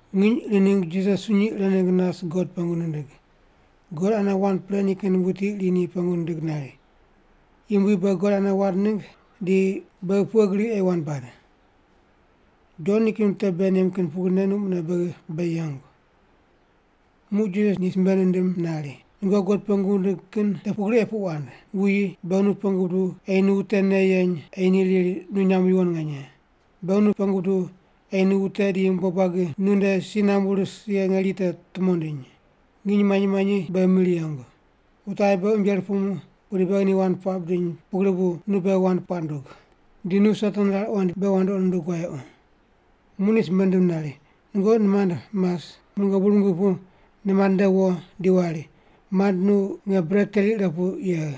Nginy iri ningg Jisas sunyi ire ningg nas God pengu nindig. God ane wand pre nikin wuti iri ni pengu nindig nari, “Yumbui, beghi God ane wand ningg di beghi pughe gri ei wand bad? Jon nikin wute bei nem kin pugrine nu mune beghi bei yengu.” Muq Jisas ni simbe nindim nari, “Nungoqi God pengu wundig kin te pugri ei puq wand: Wuyi, beghi nu pengu buduw ei nu wute nei yeny ei ni riri nu nyamb yuwon nganye. Beghi nu pengu buduw ei wute di yumbo buagi nu nde si nambu ris ye ngeri te tumo ndiny. Nginy manyi manyi beghi mir yengu. Wute aye beghi unje rupumu pudi beghi ni wand puaq bidiny pugri bu nu beghi wand puaq ndug. Di nu Satan rar qoind beghi wandoqi nundug wayequ.” Muq ni simbe nindim nari, “Nungoqi nimand mas, muq nungoqi bur mingi pu nimand nde wo di wari, ‘Mand, nu nge bret teri ire pu yegh.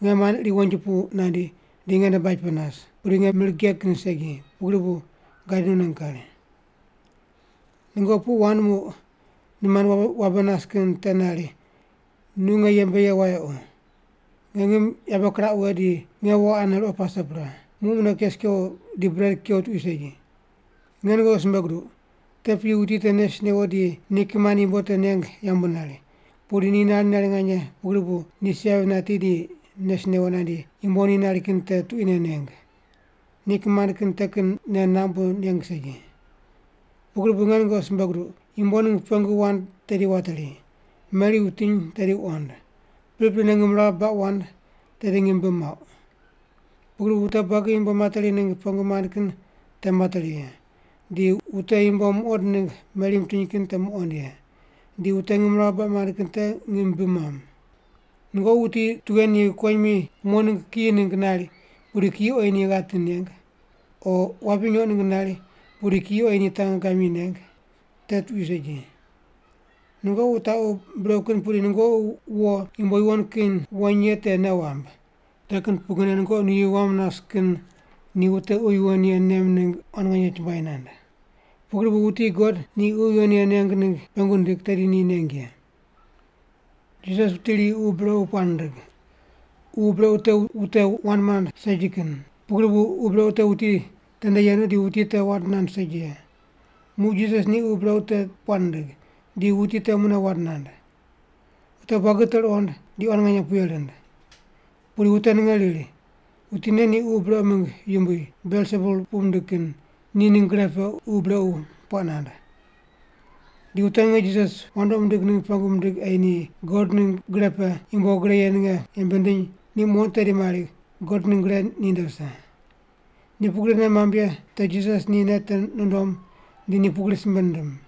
Nge mand iri wonji pu nandi, di nge nde baj pe nas, pudi nge mir geg kin segi, pugri bu gadi nu ningg kari.’ “Nungoqi puq wand muq nimand wabe nas kin te nari, ‘Nu nge yembe yegh wayequ. Nge ngim yabe kiraq wughe di nge wo ane ruqo pase pre. Muq mune kes kewo di bret kew tuqui segi.’ Nge nungoqi simbe guduq, te piyi wuti te nes newo di ni kimand yumbo te neng yambu nari, pudi ni nari nari nganye pugri bu ni si yavi nati di nes newo nandi yumbo ni nari kin tuquine neng. Ni kimand kin te kin nei namb bu neng segi. “Pugri bu nge nungoqi simbe guduq, yumbo ningg pengu wand tedi wateri, meri wutiny tedi wuqond, priprine ngimrawu baq wand tedi ngim bi muauq. Pugri bu wute buagi yumbo materi ningg pengu mand kin te materi ye, di wute yumbo muqond ningg meri mitiny kin te muqond ye, di wute ngimrawu baq mand kin te ngim bi muam. “Nungoqi wuti tughe ni kuwonyimi umo ningg kiyi ningg nari, pudi kiyi oyi ni ghati neng? O ni wapi nyoq ningg nari, pudi kiyi oyi ni tangegamyi neng? Te tuqui segi. Nungoqi wutaqu brequ kin pudi nungoqi wo yumbo yuwon kin weny ye te nei wamb. Te kin pugrine nungoqi nuyi wam nas kin ni wute Ququ Yuwon Ye nem ningg quan nganye chumbuai nand. Pugri bu wuti God ni Ququ Yuwon Ye neng ningg pengu nindig, tedi ni neng ye.” Jisas wuti iri ququ brequ puaq nindig. Ququ brequ te wute wand mand segi kin. Pugri bu ququ brequ te wuti tende yenu di wuti te wand nand segi ye. Muq Jisas ni ququ brequ te puaq nindig, di wuti te mune wand nand. Wute buagi te ruqond, di quan nganye puye rind. Pudi wute ninge riri, “Wuti nen ni ququ brequ mingg yumbui, Belsebul puq mindig kin, ni ningg gre pe ququ brequ puaq nand.” Di wute ninge Jisas wandoqi mindig ningg pengu mindig ei ni God ningg gre pe yumbo gre ye ninge yembe nindiny ni muqond tedi mari God ningg gre ninde vise. Ni pugri nei mamb ye te Jisas ni nei te nundom di ni pugri simbe nindim,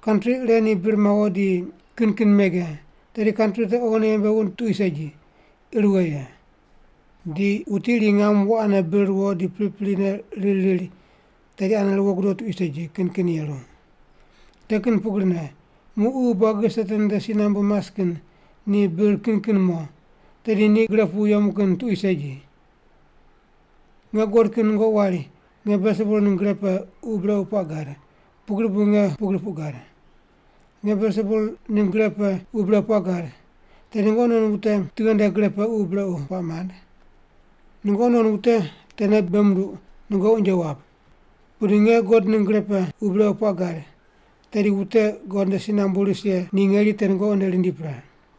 “Kantri ire ni bir mawo di kin kin mege, tedi kantri te oghine yembe wund tuqui segi, ir wughe ye. Di wuti iri ngam wo ane bir ruwo di priprine riri riri, tedi ane ruwo gudo tuqui segi, kin kin yeru. Te kin pugrine muq ququ buagi Satan nde si nambu mas kin ni bir kin kin mo, tedi ni gre pu yemu kin tuqui segi. Nge guqod kin nungoqi wari nge Belsebul ningg gre pe ququ brequ puaq gad, pugri bu nge pugri puq gad. Nge Belsebul ningg gre pe ququ brequ puaq gad, tedi nungoqi non wute tughe nde gre pe ququ brequ puaq mand? Nungoqi non wute tene bei munduq nungoqi unje wap. Pudi nge God ningg gre pe ququ brequ puaq gad, tedi wute God nde si nambu ris ye ngeri te nungoqi nde rindi pre.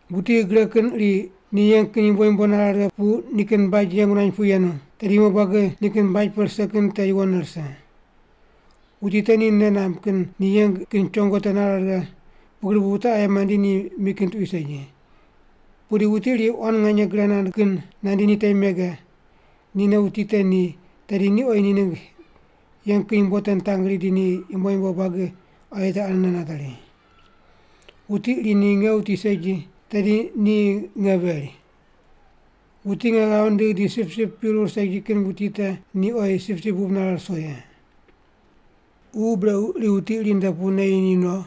“Wuti gre kin iri ni yeng kin yumbo yumbo nare pu nikin baj yeng nuany pu yenu, tedi yumbo buagi nikin baj pe rise kin te yuwonne rise. Wuti te ni nei namb kin ni yeng kin chongo te nare righe pugri bu wute aye mandi ni mi kin tuqui segi. Pudi wuti iri quan nganye gre kin nandi ni temi mege, nine wuti te ni, tedi ni oyi ni ningg yeng kin yumbo te nitangri di ni yumbo yumbo buagi aye te anene nateri. “Wuti iri ni nge wuti segi, tedi ni nge veri. Wuti nge ghav nindigh di sipsip pirur segi kin wuti te ni oyi sipsip bub nare ruso ye. “Ququ brequ iri wuti iri nde pu neyi ni no,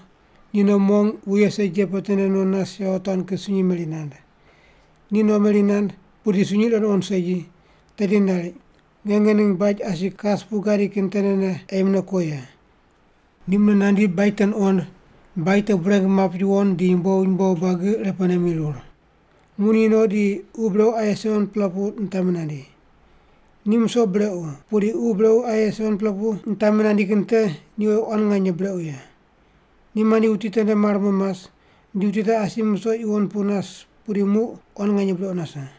ni no mong wuye segi ye pe tende no nas yawotuan kin sunyi meri nand. Ni no meri nand, pudi sunyi ire nuqond segi, tedi nari, ‘Nge ngening baj asi kas pu gadi kin tendene ei mune ko ye.’ Ni mune nandi baj te nuqond, baj te bureng map yuwon di yumbo yumbo buagi irepene mirur. Muq ni no di ququ brequ aye 7-pela pu nitami nandi. Ni musoq brequ, pudi ququ brequ aye 7-pela pu nitami nandi kin te ni oyi quan nganye brequ ye. Ni mandi wuti tende mar mo mas, di wuti te asi ni musoq yuwon pu nas pudi muq quan nganye brequ nase.”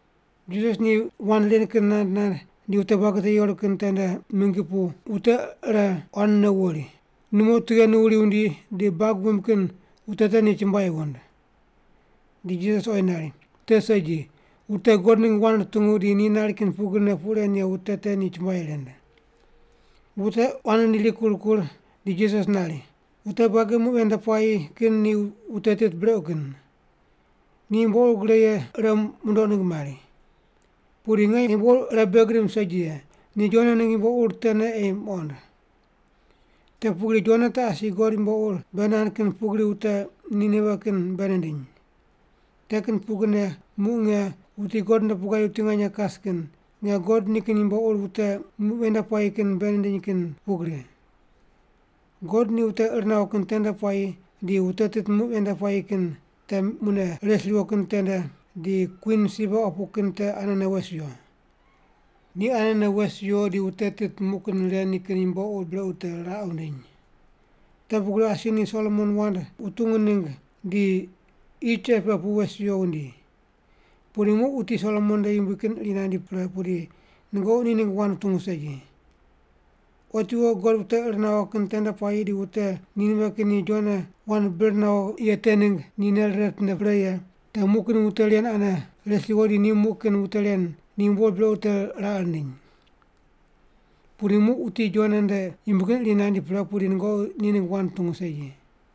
Jisas ni wand ren kin nand nand di wute buagi te yeru kin tende mingi pu wute ire quanne wuri, “Numo tughe nu wuri wundi di bag wuimb kin wute te ni chumbuai wund.” Di Jisas oyi nari, “Te segi, wute God ningg wand rutungu di ni nari kin pugrine puq ren ye wute te ni chumbuai rind.” Wute quan rindi rikur kur di Jisas nari, “Wute buagi muq ven nde puayi kin ni wute tit brequ kin. Ni yumbo ur gre ye ire mundoq ningg mari. Pudi nge yumbo ur ire bei gidim segi ye, ni Jona ningg yumbo ur tene ei muqond. Te pugri Jona te asi God yumbo ur bei nand kin pugri wute Ninive kin bei nindiny. Te kin pugrine muq nge, wuti God nde pu gadi wuti nganye kas kin, nge God nikin yumbo ur wute muq ven nde puayi kin bei nindiny kin pugri. God ni wute ir nawo kin tende puayi di wute tit muq ven nde puayi kin te mune res riwo kin tende di kwin Siba opu kin te anene wes wiyo. Ni anene wes wiyo di wute tit muq kin ren nikin yumbo ur brequ te raqe wundiny. Te pugri asi ni Solomon wand wutungu ningg di qi cheq pe pu wes wiyo wundi. Pudi muq wuti Solomon nde yumbui kin iri nandi pre pudi nungoqi ni ningg wand wutungu segi. Otiwo God wute ir nawo kin tende puayi di wute Ninive kin ni Jona wand bir nawo ye te ningg ni nei rire ritinde pre ye te muq kin wute ren anene res riwo di ni muq kin wute ren ni yumbo ur brequ te raqe rindiny. Pudi muq wuti Jona nde yumbui kin iri nandi pre pudi nungoqi ni ningg wand wutungu segi.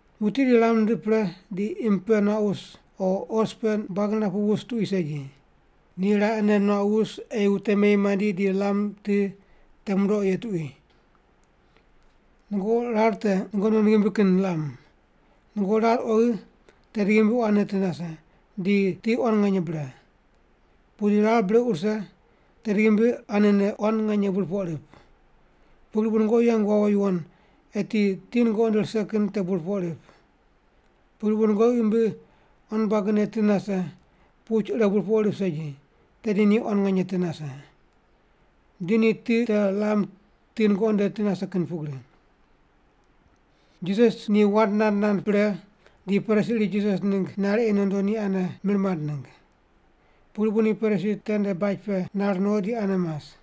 “Wuti iri lam nindiq pre di imb pe nuaq wus o os pe buag niraq pu wus tuqui segi. Ni raqene nuaq wus ei wute meyi mandi di lam ti te mundoq ye tuqui. Nungoqi rar te nungoqi non ghimbi kin lam. Nungoqi rar oghi, tedi ghimbi quanene ti nase, di ti quan nganye bre. Pudi rar brequ rise, tedi ghimbi anene quan nganye burpoq rip. Pugri bu nungoqi yeng wawo yuwon eti ti nungoqi nde rise kin te burpoq rip. Pugri bu nungoqi ghimbi quan buagine ti nase, puch ire burpoq rip segi, tedi ni quan nganye ti nase. Di ni ti te lam ti nungoqi nde ti nase kin pugri.” Jisas ni wand nand nand pre di Parisi iri Jisas ningg nari ei nondo ni ane mir mand ningg. Pugri bu ni Parisi tende baj pe nar no di ane mas.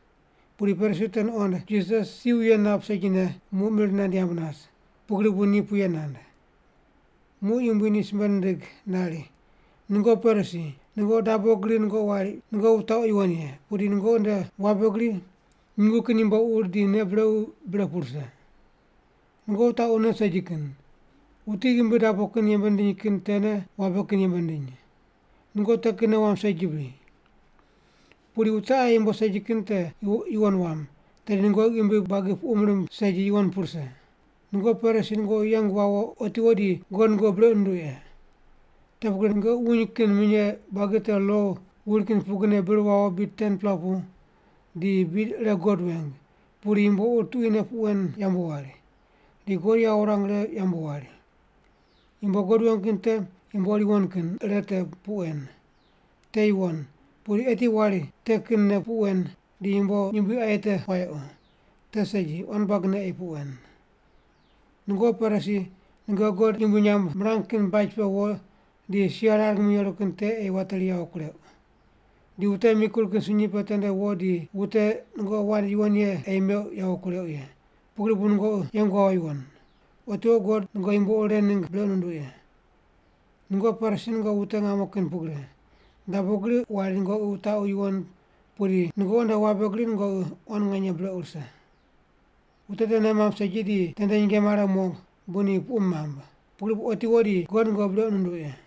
Pudi Parisi te nuqond Jisas si wuye nap segine muq mir nand yamb nas, pugri bu ni puye nand. Muq Yumbui ni simbe nindig nari, “Nungoqi Parisi, nungoqi dabo gri nungoqi wari nungoqi wutaqu yuwon ye, pudi nungoqi nde wabe gri nyungu kin yumbo ur di nei brequ bre pu rise. Nungoqi wutaqu nei segi kin! Wuti ghimbi dabo kin yembe nindiny kin tene wabe kin yembe nindiny. Nungoqi te kin nei wamb segi bri? Pudi wute aye yumbo segi kin te yuwon wam, tedi nungoqi ghimbi buagi puqum rimb segi yuwon pu rise. “Nungoqi Parisi nungoqi yeng wawo otiwo di God nungoqi brequ nunduq ye. Te pugri nungoqi wuny kin minye buagi te lo wuri kin pugrine bir wawo bid 10-pela pu di bid ire God weng, pudi yumbo ur tuquine puq wen yambu wari, di God yawo wurang righe yambu wari. Yumbo God weng kin te yumbo ur yuwon kin ire te puq wen. Te yuwon, pudi eti wari te kinne puq wen di yumbo yumbui aye te wayequ. Te segi, quan buagine ei puq wen. “Nungoqi Parisi, nungoqi God yumbui nyamb mirang kin baj pe wo di sia rar ngimi yeru kin te ei wateri yawo kureuq. Di wute mikur kin sunyi pe tende wo di wute nungoqi wand yuwon yene ei meuq yawo kureuq ye, pugri bu nungoqi yeng wawo yuwon. Otiwo God nungoqi yumbo ur ren ningg brequ nunduq ye. Nungoqi Parisi nungoqi wute ngamo kin pugri, dabo gri wari nungoqi wutaqu yuwon pudi nungoqi nde wabe gri nungoqi quan nganye brequ rise. Wute te nei mamb segi di tende nyinge mare mo bu ni puqum mamb. Pugri bu otiwo di God nungoqi brequ nunduq ye.”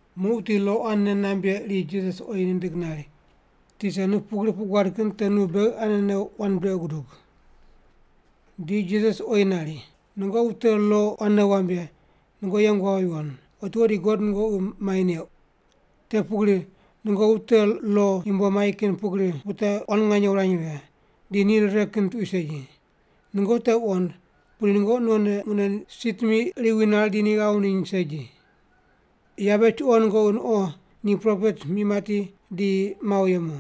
Muq wuti lo quan nei namb ye iri Jisas oyi nindig nari, “Tisa, nu pugri puq guad kin te nu beghi anene wand brequ gudug.” Di Jisas oyi nari, “Nungoqi wute lo quan nei wamb ye, nungoqi yeng wawo, otiwo di God nungoqi mai neuq. Te pugri nungoqi wute lo yumbo mai kin pugri wute quan nganye wany righe, di ni rire kin tuqui segi. Nungoqi te wuqond, pudi nungoqi nonne mune si timi iri wi nar di ni ghav wundiny segi. “Yabe chuqo nungoqi nuqo ni propet mi mati di mawo yemu.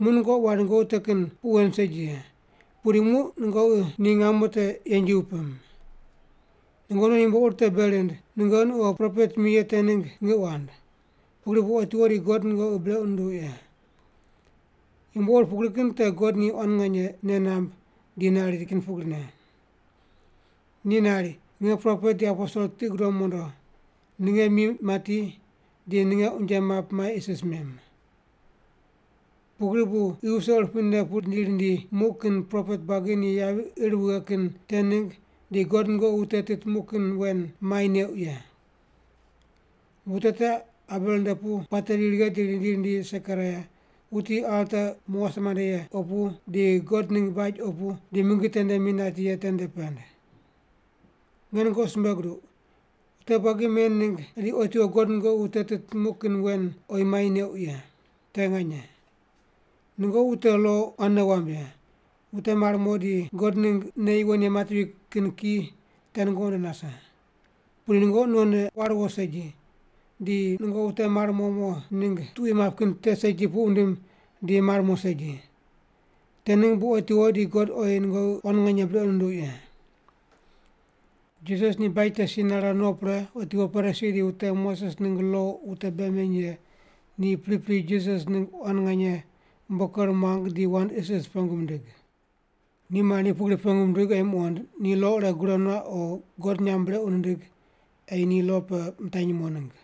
Muq nungoqi wari nungoqi te kin puq wen segi ye. Pudi muq nungoqi ni ngamo te yenji wupim. Nungoqi non yumbo ur te bei rind, nungoqi nuqo propet mi ye te ningg ngiq wand. Pugri bu otiwo di God nungoqi brequ nunduq ye. Yumbo ur pugri kin te God ni quan nganye nei namb di nari kin pugri. Ni nari, ‘Nge propet di aposel tiqi gudom mondo, ninge mi mati di ninge unje map mai isis mem.’ Pugri bu qi wuse urupui ne pu rindi rindi muq kin propet buagi ni yavi ir wughe kin te ningg di God nungoqi wute tit muq kin wen mai neuq ye. Wute te Abel nde pu puate ri righe di rindi rindi Sekaraia, wuti alta umo wase mande ye opu di God ningg baj opu di mingi tende mi nati ye tende pend. Nge nungoqi simbe guduq, wute buagi men ningg di otiwo God nungoqi wute tit muq kin wen oyi mai neuq ye. Te nganye. “Nungoqi wute lo quan nei wamb ye, wute mar mo di God ningg nei yuwon ye matevi kin ki te nungoqi nde nase. Pudi nungoqi nonne war wo segi, di nungoqi wute mar mo mo ningg tuqui map kin te segi puq wundim di mar mo segi. Te ningg bu otiwo di God oyi nungoqi quan nganye brequ nunduq ye.” Jisas ni baj te si nare no pre otiwo Parisi di wute Moses ningg lo wute bei meny ye ni pripri Jisas ningg quan nganye umbo ker muang di wand isis pengu mindig. Ni mari ni pugri pengu mindig ei muqond ni lo ire gure nuaq o God nyamb brequ nindig ei ni lo pe mitanyi mo ningg.